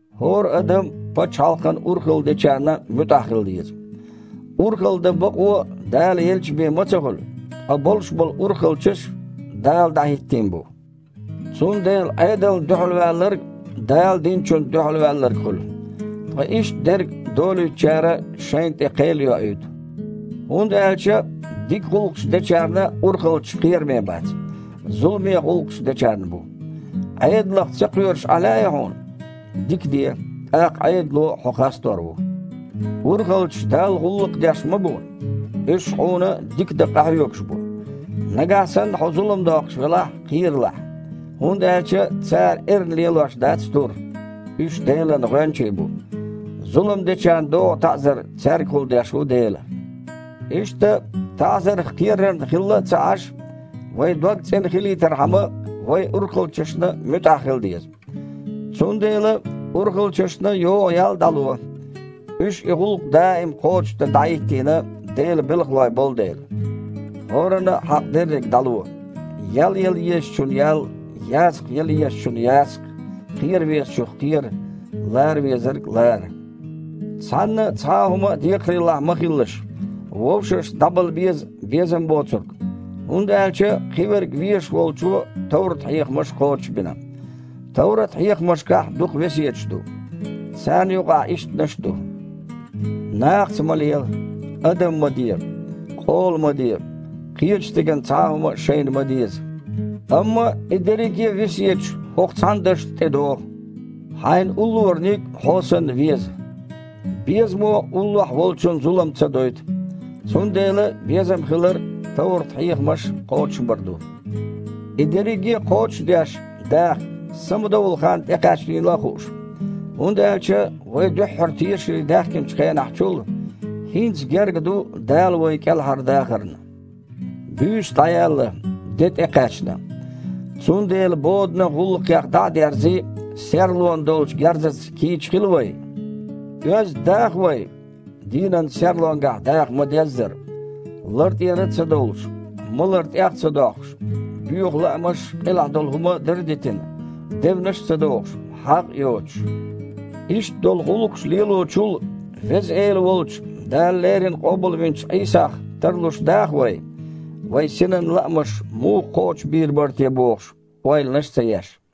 ХІора адам пачхьалкхана урхалла дечарна муьтІахь хила деза. Урхалла дан бакъо, Дала елча бен, ма ца хуьлу, ткъа болуш болу урхалчаш Дала дІахІиттийна бу. Цундела Іедална дуьхьалваьлларг Дала динчунна дуьхьалваьлларг хуьлу. Ткъа иштта дерг долуьйтучара шайна тІе кхел йоуьйту. ХІунда аьлча дика гІуллакхаш дечарна урхалчаш кхераме бац, зуламе гІуллакхаш дечарна бу. Іедалах ца кхоьруш Іен лаьий хьуна? Дика де, тІаккха Іедало хьо хастор ву. Урхалчаш Далла гІуллакх деш ма бу. Уьш хьуна дика дан къахьоьгуш бу. Нагахь санна хьо зулам доккхуш велахь, кхералахь. ХІунда аьлча цара эрна лелош дац тур: уьш Делан гІоьнчий бу, зулам дечарна догІу таІзар цаьргахула деш ву Дела. Иштта, таІзарх кхерарна хилла а ца Іаш, вайн дог цІена хилийтархьама, вай урхалчашна муьтІахь хила деза. Цундела урхалчашна йогІу ял дІало, уьш и гІуллакх даим кхочушдан дІахІиттийна Делан белхалой болу дела. ХІоранна а хьакъ дерриг дІало: ял яла езачунна – ял, ясакх яла езачунна – ясакх, кхера везачух – кхера, лара везарг – лара. Цхьанна а цхьа а хІума декхарийлахь ма хилалаш, вовшашна дІабала беза безам боцург, хІунда аьлча кхиверг везаш волчо товрат-хьехамаш кхочушбина. Товрат-хьехамашкахь дукха весеташ ду. Царна юкъахь ишттанаш а ду: «Нахаца ма лела, адам ма де, къола ма де, кхечу стеган цхьа а хІума шайна ма деза». Амма и дерриге а весеташ хІокху цхьана дашна тІедогІу: «Хьайн уллораниг хьо санна веза». Безамо уллохь волчунна зулам ца дойту. Цундела безам хилар – товрат-хьехамаш кхочушбар ду. И дерриге а кхочуш а деш, даха, самадовла хан тІекхаьчнийла а хууш, хІунда аьлча вай дуьххьара тешаре даьхкинчу хенахь чул, хІинца герга ду Дала вай кІелхьардахарна. Буьйса дІаяьлла, де тІекхаьчна. Цундела боданан гІуллакхех дІа а дерзий, серлонан долчу герзаца кийча хила вай. Оьзда даха вай, дийнан серлонгахь даха ма-деззара: лар тІера а ца довлуш, малар тІех а ца доккхуш, боьха лаамаш а, къилахь долу хІума дар а дитина, девнаш а ца дохуш, хьагІ а йоцуш. Иштта долу гІуллакхаш лелочул, Веза Эла волчу, Дала леррина къобалвинчу Іийсах тарлуш даха вай, вайн синан лаамаш муха кхочушбийр бара те бохуш, ойланаш а ца еш.